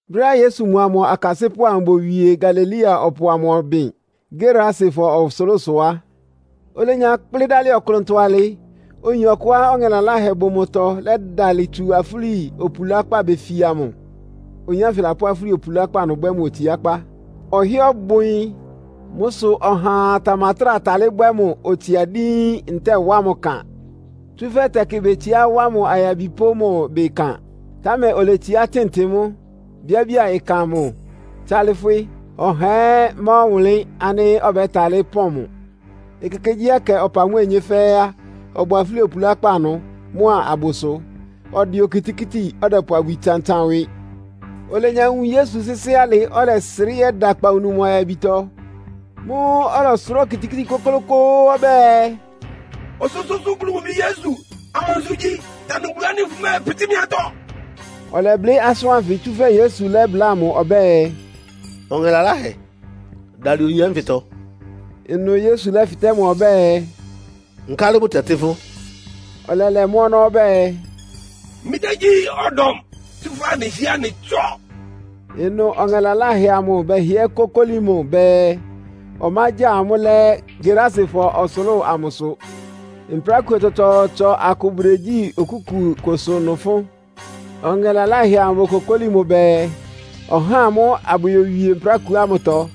Brɛ́á Yesu mʋa mʋ akasɩ́pʋ́ amʋ bowie Galilea ɔpʋ amʋ ɔbɩn Gerasefɔ ɔsʋlʋ́sʋ á, olenya kplɩ́ dálɩ ɔklʋntɔ alɩ, oyin ɔkʋá ɔŋɛ laláhɛ bʋ mʋtɔ lɛ́dalɩ tsu afúli opulákpá befia mʋ. Oyin ánfɩ lapʋ́ afúli opulákpá ɩnʋ bwɛ́ mʋ otsiákpá. Ɔhɩ́ɛ́ ɔbʋ ɩyɩn. Mʋ́ sʋ ɔhaa tamatráa talɩ́ bwɛ́ mʋ otsia díín, ntɛ́ɛ wá mʋ ɩkan. Tsúfɛ́ tɛkɩ betsiá wá mʋ ayabi pʋ́ mʋ ɩbɩ ɩkan, támɛ oletsiá tɩn mʋ́, bíábía ɩkan amʋ tsálɩ́fwɩ́. Ɔhaa ɛ́ má ɔwʋnlɩ́n ánɩ́ ɔbɛ́talɩ́ pɔ́n mʋ. Ekekegyíɛkɛ ɔpa mʋ́a onyé fɛ́ɛ́ á, ɔbʋ afúli opulákpá ɩnʋ mʋ́a abʋsʋ, ɔdɛ okitikíti, ɔdɛpʋ abwi tsantsan ɩwɩ. Olenya wun Yesu sɩ́sɩ́ alɩ, ɔlɛsrɩ́ yɛ́da akpawunu mʋ ayabitɔ. Mʋ́ʋ́ ɔlɔsʋrá okitikíti kʋ́klʋ́kʋ́ʋ́ ɔbɛ́ɛ, “Ɔsʋ́sʋ́ʋ́sʋ́ Bulu mʋ Bi Yesu, amansʋ igyi? Tanʋ Bulu ánɩ́ fʋmɛ́ɛpɩtɩ́ mɩ́ atɔ́!” Ɔlɛblɩ́ asʋ́n ánfɩ, tsúfɛ́ Yesu lɛ́bláa mʋ ɔbɛ́ɛ, “Ɔŋɛ laláhɛ, dalɩ oyin ánfɩtɔ.” Ɩnʋ Yesu lɛ́fɩtɛ́ mʋ ɔbɛ́ɛ, “Nkálɩ bʋtɛtɩ́ fʋ́?” Ɔlɛlɛ mʋ́ ɔnɔ́ ɔbɛ́ɛ, “Mɩ́ dá gyí, ‘Ɔdɔm’, tsúfɛ́ anɩhɩ́ɛ́ anɩ tsɔ́.” Ɩnʋ ɔŋɛ laláhɛ amʋ bɛhɩɛ kókóli mʋ bɛɛ, ɔmágya amʋ́ lɛ́ Gerasefɔ ɔsʋlʋ́ʋ amʋsʋ. Mprákuo tsɔtsɔɔtsɔ akʋ bʋdegyí okúku kʋsʋ ɩnʋ fʋ́n. Ɔŋɛ laláhɛ amʋ bokokóli mʋ bɛɛ, ɔhá amʋ́ abʋyowie mprákuo ámʋtɔ.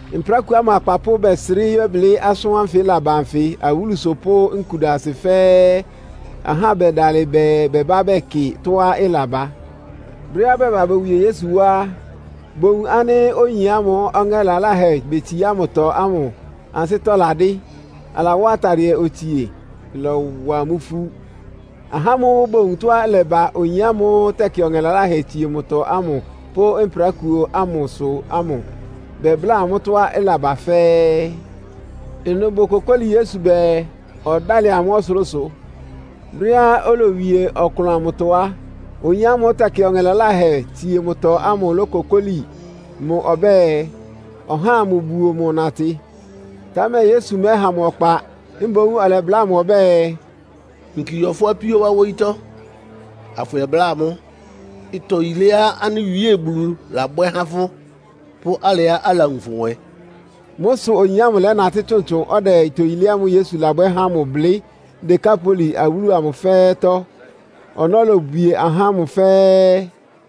Mprákuo ámʋ akpapʋ́ bɛsrɩ́ yɛ́blɩ́ asʋ́n ánfɩ ɩlaba anfɩ awúlusʋ pʋ́ nkudasɩ fɛ́ɛ́. Ahá bɛdalɩ bɛɛ bɛbá bɛkɩ tɔ́á ɩlaba. Brɛ́á bɛba bowie Yesu wá á, bowun ánɩ́ oyin ámʋ́ʋ́ ɔŋɛ laláhɛ betsiá mʋtɔ ámʋ ansɩ́tɔ́ ladɩ́, alawá atadɩɛ otsie. Ɩlɔwa amʋ́ ifú. Ahá ámʋ́ʋ́ bowun tɔ́á ɩlɛba oyin ámʋ́ʋ́ tɛkɩ ɔŋɛ laláhɛ tsie mʋtɔ ámʋ pʋ́ mprákuo ámʋsʋ ámʋ bɛbláa amʋ́ tɔ́á ɩlaba fɛ́ɛ́. Ɩnʋ bokokóli Yesu bɛɛ, ɔdálɩ amʋ́ ɔsʋlʋ́sʋ. Brɛ́á olowie ɔklʋn amʋtɔ á, oyin ámʋ́ʋ́ tɛkɩ ɔŋɛ laláhɛ tsie mʋtɔ ámʋ lókokóli mʋ ɔbɛ́ɛ, ɔhá amʋbuo mʋ natɩ. Támɛ Yesu mɛ́ha mʋ ɔkpa. Mboún ɔlɛbláa mʋ ɔbɛ́ɛ, “Yinki yɔ fʋ́ apíó wá wóyítɔ́, afʋyɛbláa amʋ́ ɩtɔ yiléá anɩ Wíe Bulu labwɛ́ há fʋ́, pʋ́ alɩá alawun fʋ nwɛ.” Mʋ́ sʋ oyin ámʋ lɛ́natɩ́ tsʋntsʋn, ɔdɛ ɩtɔ yilé ámʋ́ʋ́ Yesu labwɛ́ há mʋ blɩ́ Dekapoli awúlu amʋ fɛ́ɛ́tɔ́. Ɔnɔ́ lobwie ahá ámʋ fɛ́ɛ́.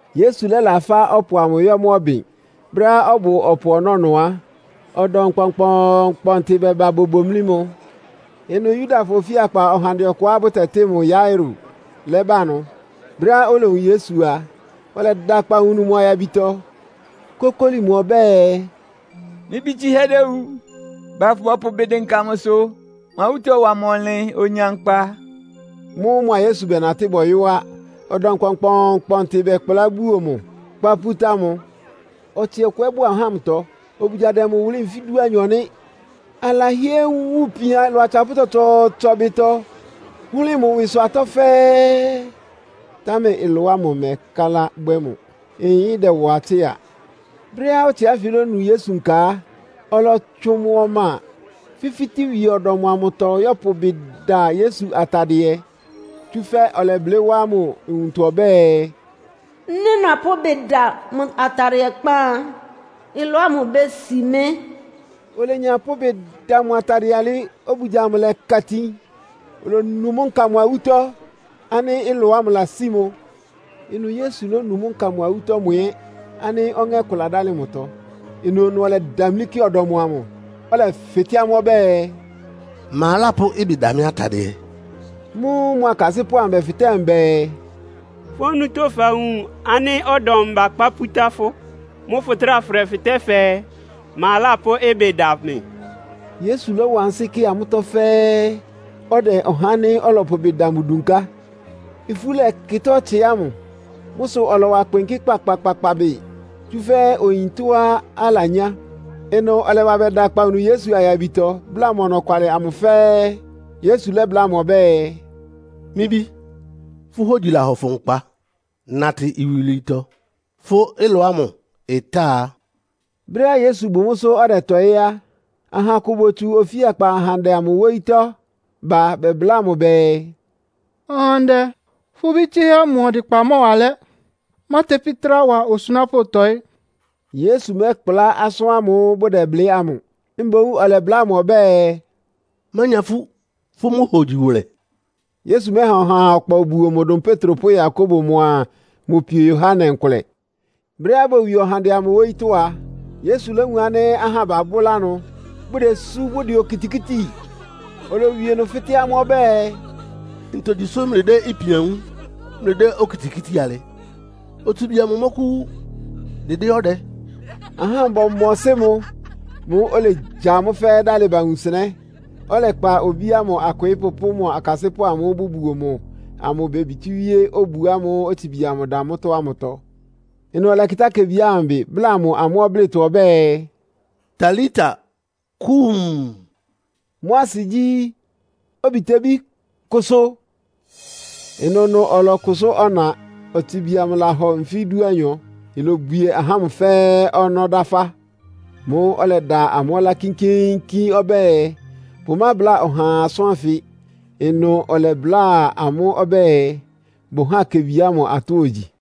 Yesu lɛ́la fá ɔpʋ amʋ yɔ́ mʋ́ ɔbɩn. Brɛ́á ɔbʋ ɔpʋ ɔnɔ́ ɩnʋ á, ɔdɔm kpɔnkpɔɔnkpɔntɩ bɛba bobomlí mʋ. Ɩnʋ Yudafɔ ofíakpa ɔhandɛ ɔkʋá bʋtɛtɩ́ mʋ Yairo lɛ́ba ɩnʋ. Brɛ́á olowun Yesu a, ɔlɛda akpawunu mʋ ayabitɔ, kókóli mʋ ɔbɛ́ɛ, “Mɩ́ bí tsɩ́hɛ́ déwu. Ba, afʋbɔpʋ ɩbɩ dɩnka mʋsʋ, mʋ awútɔ́ ɩwa mʋ ɔnlɩn, onya nkpa.” Mʋ́ʋ́ mʋa Yesu bɛnatɩ́ bɔyɔ́ á. Ɔdɔm kpɔnkpɔɔnkpɔntɩ bɛkplá buo mʋ, kpá pútá mʋ. Ɔtsɩ ɔkʋ ɛ́ bʋ ahá ámʋtɔ, obugya dɛ mʋ wʋlɩ́ nfí dúanyɔ nɩ́. Alahɩ́ɛ́ wun ipian ɩlɔ atsapʋ́ tsɔtsɔɔtsɔ ɩbɩtɔ, hʋ́lɩ mʋ ɩwɩsʋ atɔ́ fɛ́ɛ́, támɛ ɩlɔ ámʋ ɩmɛkálá bwɛ́ mʋ. Ɩyɩn ɩdɛwa tsɩ́a. Brɛ́á ɔtsɩ ánfɩ lónu Yesu nka á, ɔlɔtsʋn yɔ mʋ ɔma, fifítíwie ɔdɔm amʋtɔ yɔ́pʋ ɩbɩ da Yesu atadɩɛ. Tsúfɛ́ ɔlɛblɩ́ wá mʋ nwuntɔ ɔbɛ́ɛ, “Nɩ́ nɔpʋ́ ɩbɩ da mʋ atadɩɛ kpán á, ɩlɔ ámʋ ibési mɩ́.” Olenya pʋ́ ɩbɩ da mʋ atadɩɛ ámʋ alɩ, obugya amʋ lɛ́ka itin. Olonu mʋ́ nka mʋ awútɔ́ ánɩ́ ɩlɔ ámʋ lasí mʋ. Ɩnʋ Yesu lónu mʋ́ nka mʋ awútɔ́ mʋ ɛ́ ánɩ́ ɔŋɛ́ kʋ ladálɩ mʋtɔ. Ɩnʋnʋ ɔlɛdamlí kɩ ɔdɔm amʋ, ɔlɛfɩtɛ́ amʋ́ ɔbɛ́ɛ, “Ma lápʋ́ ɩbɩ da mɩ́ atadɩɛ?” Mʋ́ʋ́ mʋ akasɩ́pʋ́ amʋ bɛfɩtɛ́ mʋ bɛɛ, “Fʋ́ onutó fawun ánɩ́ ɔdɔm bakpá pútá fʋ. Mʋ́ʋ́ fʋtráa fʋdɛfɩtɛ́ fɛɛ, ‘Ma lápʋ́ ɩbɩ da mɩ?’” Yesu lɔ́wa ansɩ́ kɩ amʋ́tɔ́ fɛ́ɛ́, ɔdɛ ɔhá ánɩ́ ɔlɔpʋ ɩbɩ da mʋ dunká. Ifú lɛ́kɩtá ɔtsɩ ámʋ. Mʋ́ sʋ ɔlɔwa kpɩnkɩ́ kpakpakpakpa bɩ, tsúfɛ́ oyin ɩtɔ́á alanyá. Ɩnʋ ɔlɛba bɛda akpawunu Yesu ayabitɔ, bláa mʋ ɔnɔkwalɩ amʋ fɛ́ɛ́. Yesu lɛ́bláa mʋ ɔbɛ́ɛ, “Mɩ́ bí, fʋ́ hógyi lahɔ fʋ nkpa. Natɩ iwilwiitɔ. Fʋ́ ɩlɔ ámʋ ɩta.” Brɛ́á Yesu bʋ mʋ́sʋ́ ɔdɛtɔɩ́ á, aha akʋ botsu ofíakpa ɔhandɛ amʋ wóyítɔ́ ba bɛbláa mʋ bɛɛ, “Ɔhandɛ, fʋ́ bí tsɩ́hɛ́ ámʋ ɔdɩkpa mɔ́wa alɛ́. Mátepí trá wa osunápʋ́ tɔ́ɩ.” Yesu mɛ́kplá asʋ́n ámʋ́ʋ́ bʋdɛblɩ́ ámʋ. Mboún ɔlɛbláa mʋ ɔbɛ́ɛ, “Mánya ifú. Fʋ́ mʋ́ hogyi wʋlɛ.” Yesu mɛ́ha ɔhaa ɔkpa obuo mʋ dʋn Petro pʋ́ Yakobo mʋa mʋ pio Yohane nkʋlɛ. Brɛ́á bowie ɔhandɛ amʋ wóyítɔ́ á, Yesu lówun ánɩ́ ahá babʋ́lá ɩnʋ, bʋdesú, bʋdɛ okitikíti. Olowie ɩnʋ fɩ́tɛ́ amʋ́ ɔbɛ́ɛ, “Ntogyi sʋ́ mlɩdɛ́ ipian wúun, mlɩdɛ́ okitikíti alɩ? Otsibi amʋ mɔ́kʋ́wú, dɩdɩ́ ɔdɛ.” Ahá ámʋ bɔmɔsɩ́ mʋ. Mʋ́ʋ́ olegya amʋ́ fɛ́ɛ́ dálɩ ba wunsɩnɛ́, ɔlɛkpa obí ámʋ akwɩɩ́pʋ́ pʋ́ mʋ akasɩ́pʋ́ amʋ́ʋ́ bʋbuo mʋ amʋ bebitíwíé obu ámʋ́ʋ́ otsibi amʋ da mʋ́tɔ́ ámʋtɔ. Ɩnʋ ɔlɛkɩtá kebi ámʋ ɩbɩ, bláa mʋ amʋ́ ɔblɩ́tɔ ɔbɛ́ɛ, “Talita Kuum!” (Mʋ́ asɩ gyí, “Obitebí, kʋsʋ!”) Ɩnʋnʋ ɔlɔkʋsʋ́ ɔna. (Otsibi amʋ lahɔ nfí dúanyɔ.) Ilobwie ahá ámʋ fɛ́ɛ́ ɔnɔ́ dáfá. Mʋ́ʋ́ ɔlɛda amʋ́ ɔlá kínkíínkín ɔbɛ́ɛ, bʋmábláa ɔhaa asʋ́n ánfɩ. Ɩnʋ ɔlɛbláa amʋ́ ɔbɛ́ɛ, bʋháa kebi ámʋ atɔ́ ogyi.